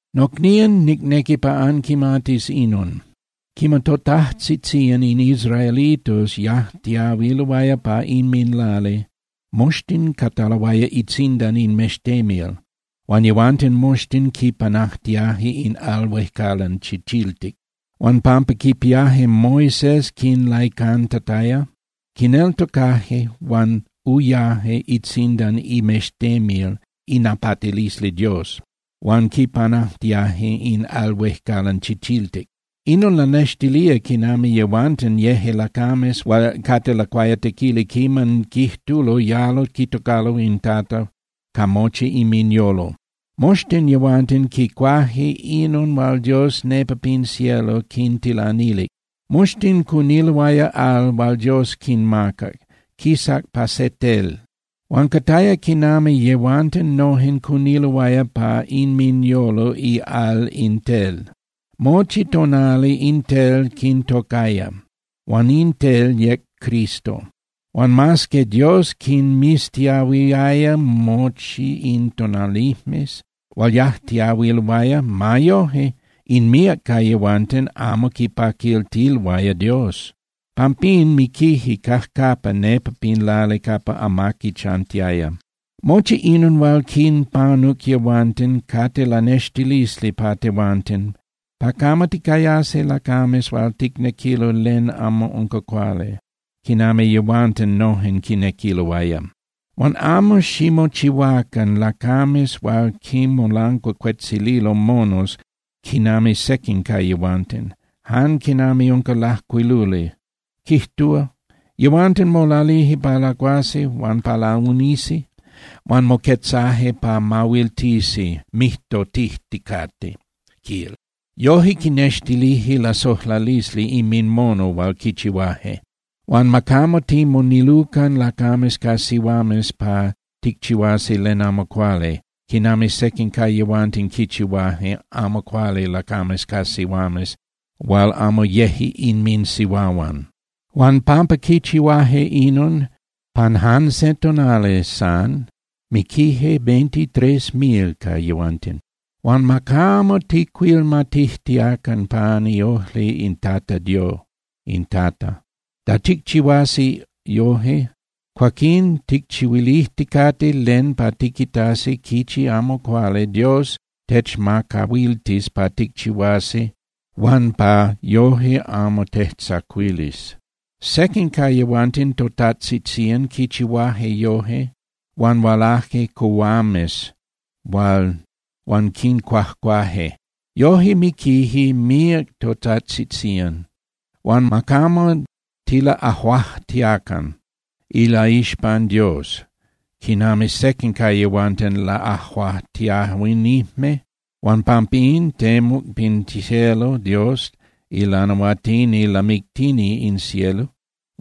Nocnían, nicnequi pa anquimatis inon: Quiman totajtzitzían in israelitos yajtiahuiloaya pa inminlali, moxtin cataloaya itzindan in mextemil, huan yehuanten moxtin quipanajtiaje in Al Huejcalan Chichiltic. Huan pampa quipiaje Moisés quinlaicantataya, quineltocaje huan uyaje itzindan imextemil inapatilisli Dios huan quipanajtiaje in Al Huejcalan Chichiltic. Inon lanextilía quinami yehuanten yeje lacames hual cate lacuayatequili quiman quijtulo yalo quitocalo in Tata ca mochi inminyolo. Moxtin yehuanten quicuaje inon hual Dios nepa pin cielo quintilanilic. Moxtin cuniloaya al hual Dios quinmacac, quisac pa se tel. Huan cataya quinami yehuanten noje cuniloaya pa inminyolo ial in Tel. Mochi tonali in Tel quintocaya, huan in Tel yec Cristo. Huan mas que Dios quinmiztiahuiaya mochi in tonalijmes hual yajtiahuiloaya, ma yoje, in míac ca yehuanten amo quipaquiltiloaya Dios. Pampín miquije cajcapa nepa pin lali capa amaqui chantiaya. Mochi inon hual quinpanuc yehuanten cate lanextilisli pa tehuanten, pa camo ticayasi lacames hual ticnequilo len amo unca cuali, quinami yehuanten nojen quinequiloaya. Huan amo ximochihuacan lacames hual quinmolancuacuetzililo monos quinami sequin ca yehuanten, jan quinami unca lajcuiluli, quijtúa: “Yehuanten molalije pa lacuasi huan pa launisi, huan moquetzaje pa mahuiltisi mijtotijticate”, quil. (Yoje quinextilije lasojlalisli inminmono hual quichihuaje.) Huan ma camo timonilucan lacames ca sihuames pa ticchihuasi len amo cuali, quinami sequin ca yehuanten quichihuaje amo cuali lacames ca sihuames hual amo yeje inminsihuahuan. Huan pampa quichihuaje inon, pan jan se tonali san miquije veintitrés mil ca yehuanten. Huan ma camo tijcuilmatijtiacan pan iojli in Tata. Da ticchihuasi yoje, cuaquín ticchihuilijticate len pa tiquitasi quichi amo cuali Dios techmacahuiltis pa ticchihuasi huan ma yoje amo tejtzacuilis. Sequin ca yehuanten totajtzitzían quichihuaje yoje, huan hualaje cuhuames huan quincuajcuaje. Yoje miquije míac totajtzitzían. Huan ma camo tilaꞌajuajtiacan ilaixpan Dios quinami sequin ca yehuanten laꞌajuajtiahuinijme huan pampín temuc pin cielo Dios ilanahuatini lamictini in cielo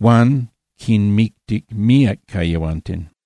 huan quinmictic míac ca yehuanten.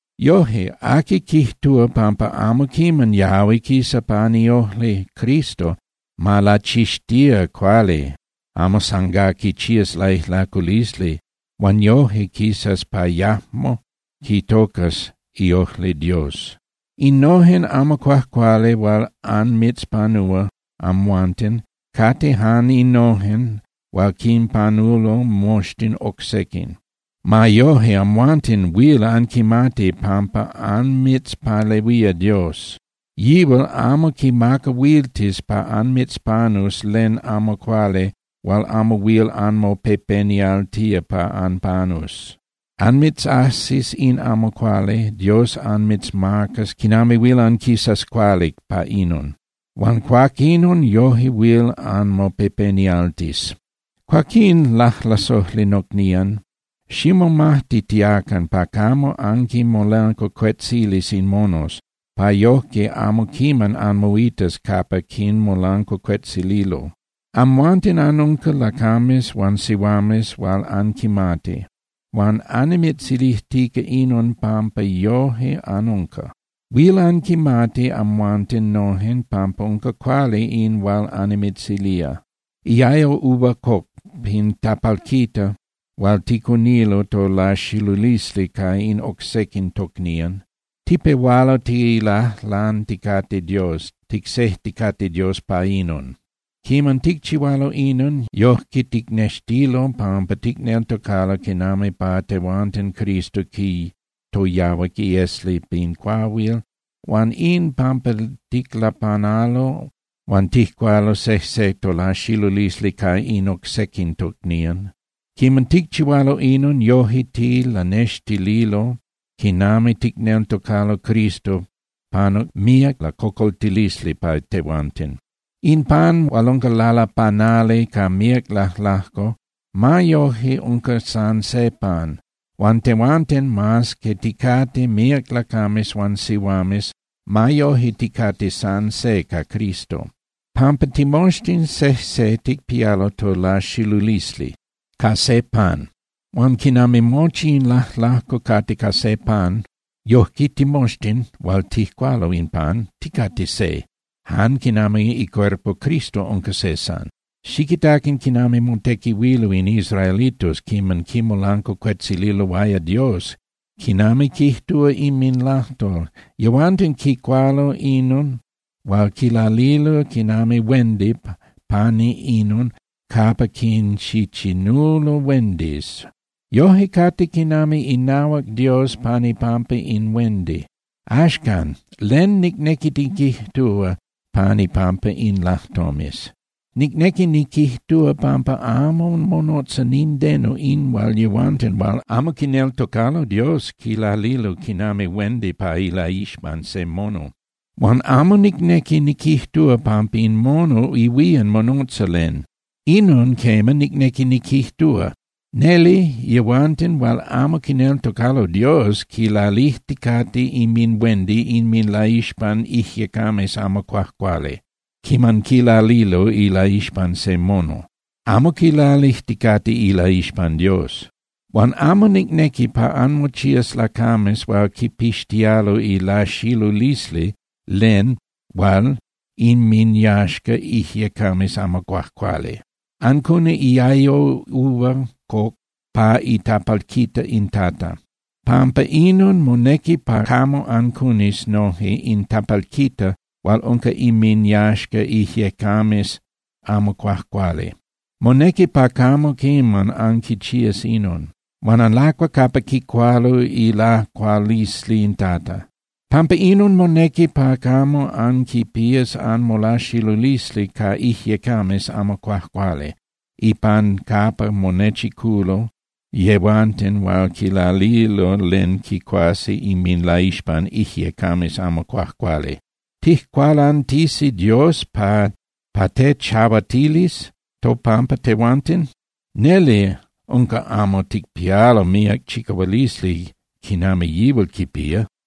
Yoje, aqui quijtúa pampa amo quiman yahui quisa pan iojli Cristo, ma lachixtía cuali amo san gá quichías laijlaculisli huan yoje quisas pa yajmo quitocas iojli Dios. Innojen amo cuajcuali hual anmitzpanúa amhuanten cate jan innojen hual quinpanulo moxtin oc sequin. Ma yoje, amhuanten huil anquimati pampa anmitzpalehuía Dios. Yihual amo quimacahuiltis pa anmitzpanus len amo cuali hual amo huil anmopepenialtía pa anpanus. Anmitzajsis in amo cuali, Dios anmitzmacas quinami huil anquisas cuali pa inon, huan cuaquinon yoje huil anmopepenialtis. Cuaquín, lajlasojli nocnían, ximomajtitiacan pa camo anquinmolancuacuetzilis in monos, pa yojque amo quiman anmoitas capa quinmolancuacuetzililo. Amhuanten anunca lacames huan sihuames hual anquimati, huan annimitzilijtica inon pampa yoje anunca. Huil anquimati amhuanten nojen pampa unca cuali in hual annimitzilía. Iayo uva coc pin tapalquita hual ticunilo tolaxilulisli ca in oc sequin tocnían, tipehualo tilajlanticate Dios, ticsejticate Dios pa inon. Quiman ticchihualo inon, yojque ticnextilo pampa ticneltocalo quinami pa tehuanten Cristo quitoyahuac iesli pin cuahuil. Huan in pan ticlapanalo huan tijcualo sejse tolaxilulisli ca in oc sequin tocnían. Quiman ticchihualo inon, yoje tilanextililo quinami ticneltocalo Cristo panuc míac lacocoltilisli pa tehuanten. In pan hual unca lalapanali ca míac lajlajco, ma yoje unca san se pan. Huan tehuanten, mas que ticate míac lacames huan sihuames, ma yoje ticate san se ca Cristo, pampa timoxtin sejse ticpialo tolaxilulisli ca se pan. Huan quinami mochi in lajlajco cate ca se pan, yojque timoxtin hual tijcualo in pan, ticate se, jan quinami icuerpo Cristo unca se san. Xiquitacan quinami motequihuilo in israelitos quiman quimolancuacuetzililoaya Dios quinami quijtúa inminlajtol. Yehuanten quicualo inon hual quilalilo quinami huendi pani inon capa quinchichinulo huendis. Yoje cate quinami inahuac Dios pan ipampa in huendi. Axcan, ¿len nicnequi niquijtúa pan ipampa in lajtomes? Nicnequi niquijtúa pampa amo monotza nindeno in hual yehuanten hual amo quineltocalo Dios quilalilo quinami huendi pa ilaixpan se mono. Huan amo nicnequi niquijtúa pampa in mono ihuían monotza len. Inon, quema, nicnequi niquijtúa: Neli, yehuanten hual amo quineltocalo Dios quilalijticate inminhuendi inminlaixpan ijyecames amo cuajcuali quiman quilalilo ilaixpan se mono. Amo quilalijticate ilaixpan Dios. Huan amo nicnequi pa anmochías lacames hual quipixtialo ilaxilulisli len hual inminyaxca ijyecames amo cuajcuali. Ancuni iayo uva coc pa itapalquita in Tata. Pampa inon monequi pa camo ancunis noje in tapalquita hual unca inminyaxca ijyecames amo cuajcuali. Monequi pa camo quiman anquichías inon. Huan anlacua capa quicualo ilacualisli in Tata. Pampa inon monequi pa camo anquipías anmolaxilulisli ca ijyecames amo cuajcuali ipan capa monechiculo yehuanten hual quilalilo len quicuasi inminlaixpan ijyecames amo cuajcuali. ¿Tijcualantisi Dios pa tejchahuatilis topampa tehuanten? ¡Neli unca amo ticpialo míac chicahualisli quinami yihual quipía!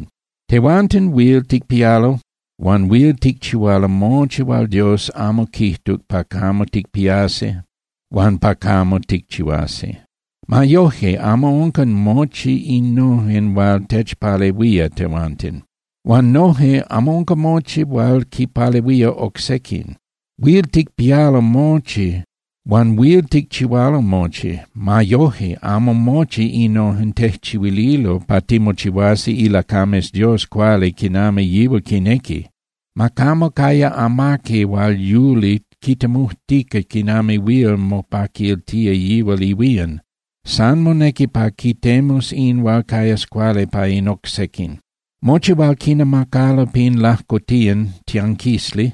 Tehuanten huil ticpialo huan huil ticchihualo mochi hual Dios amo quijtuc pa camo ticpiasi huan pa camo ticchihuasi. Ma yoje, amo unca mochi innojen hual techpalehuía tehuanten. Huan noje amo unca mochi hual quinpalehuía oc sequin. Huil ticpialo mochi huan huil ticchihualo mochi. Ma yoje amo mochi innojen tejchihuililo pa timochihuasi ilacames Dios cuali quinami yihual quinequi. Ma camo caya amaqui hual yuli quitemujtica quinami huil mopaquiltía yihual ihuían. San monequi pa quitemus in hual cayas cuali pa in oc sequin. Mochi hual quinamacalo pin lajcotiyan (tianquisli)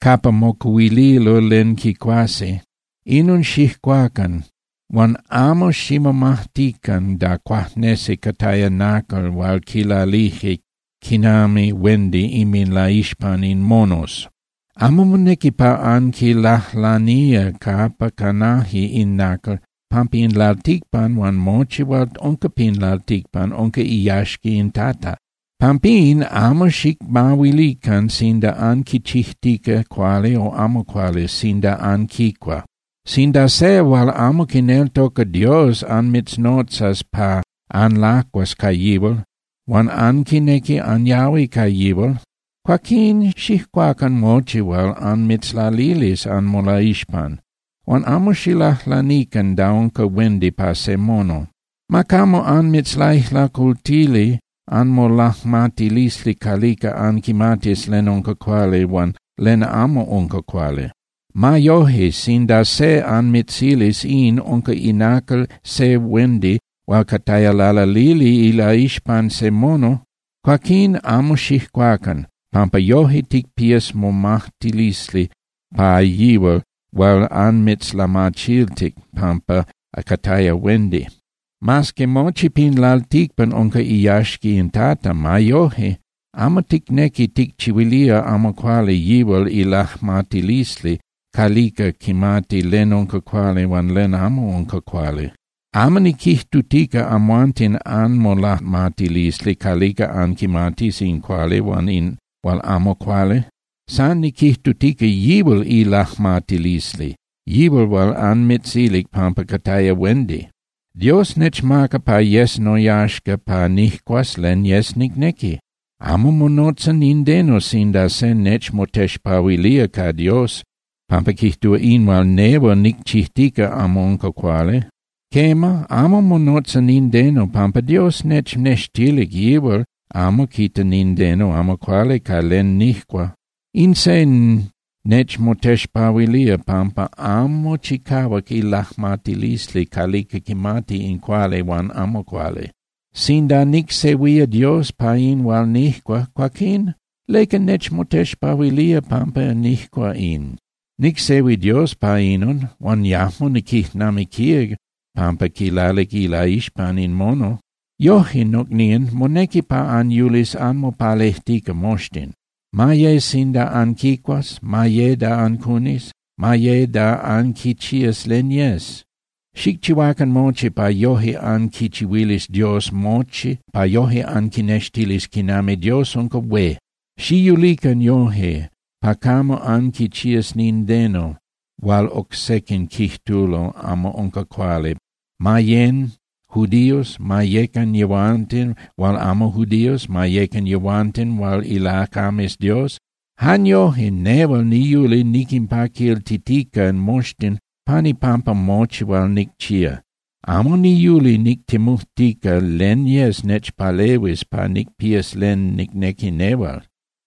capa mocuhuililo len quicuasi, inon xijcuacan huan amo ximomajtican da cuajnesi cataya nacal hual quilalije quinami huendi inminlaixpan in monos. Amo monequi pa anquilajlanía capa canaje in nacal pampa in lalticpan huan mochi hual unca pin lalticpan unca iyaxca in Tata. Pampín amo xicmahuilican sinda anquichijtica cuali o amo cuali sinda anquicua. Sinda se hual amo quineltoca Dios anmitznotzas pa anlacuas ca yihual, huan anquinequi anyahui ca yihual, cuaquín xijcuacan mochi hual anmitzlalilis anmolaixpan, huan amo xilajlanican da unca huendi pa se mono. Ma camo anmitzlaijlacultili anmolajmatilisli calica anquimatis len unca cuali huan len amo unca cuali. Ma yoje, sinda se anmitzilis in unca inacal se huendi hual cataya lalalili ilaixpan se mono, cuaquín amo xijcuacan, pampa yoje ticpías momajtilisli pa yihual hual anmitzlamachiltic pampa cataya huendi. Mas que mochi pin lalticpan unca iyaxca in Tata, ma yoje amo ticnequi ticchihuilía amo cuali yihual ilajmatilisli calica quimati len unca cuali huan len amo unca cuali. Amo niquijtutica amhuanten anmolajmatilisli calica anquimatis in cuali huan in hual amo cuali. San niquijtutica yihual ilajmatilisli, yihual hual anmitzilic pampa cataya huendi. Dios nechmaca pa yes noyaxca pa nijcuas len yes nicnequi. Amo monotza nindeno sinda se nechmotexpahuilía ca Dios pampa quijtúa in hual nehual nicchijtica amo unca cuali. Quema, amo monotza nindeno, pampa Dios nechnextilic yihual amo quita nindeno amo cuali ca len nijcua. In se nechmotexpahuilía pampa amo chicahuac ilajmatilisli calica quimati in cuali huan amo cuali. Sinda nicsehuía Dios pa in hual nijcua, cuaquín ¿leca nechmotexpahuilía pampa nijcua in? Nicsehuic Dios pa inon, huan yajmo niquijnamiquía pampa quilalic ilaixpan in mono. Yoje, nocnían, monequi pa anyulis anmopalejtica moxtin, ma ye sinda anquicuas, ma ye da ancunis, ma ye da anquichías len yes. Xicchihuacan mochi pa yoje anquichihuilis Dios mochi pa yoje anquinextilis quinami Dios unca hué. Xiyulican yoje pa camo anquichías nindeno hual oc sequin quijtulo amo unca cuali, ma yén (yecan) judíos, ma yecan yehuanten hual amo judíos, ma yecan yehuanten hual ilacames Dios. Jan yoje, nehual niyuli niquinpaquiltitica moxtin pan ipampa mochi hual nicchía. Amo niyuli nictemujtica len yes nechpalehuis pa nicpías len nicnequi nehual.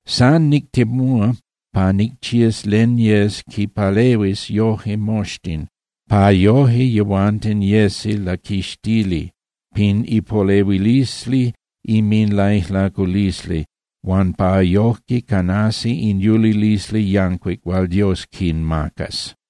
San nictemúa pa nicchías len yes quinpalehuis yoje moxtin, pa yoje yehuanten yesi laquixtili pin ipolehuilisli inminlaijlaculisli huan pa yoje canasi in yulilisli yancuic hual Dios quinmacas.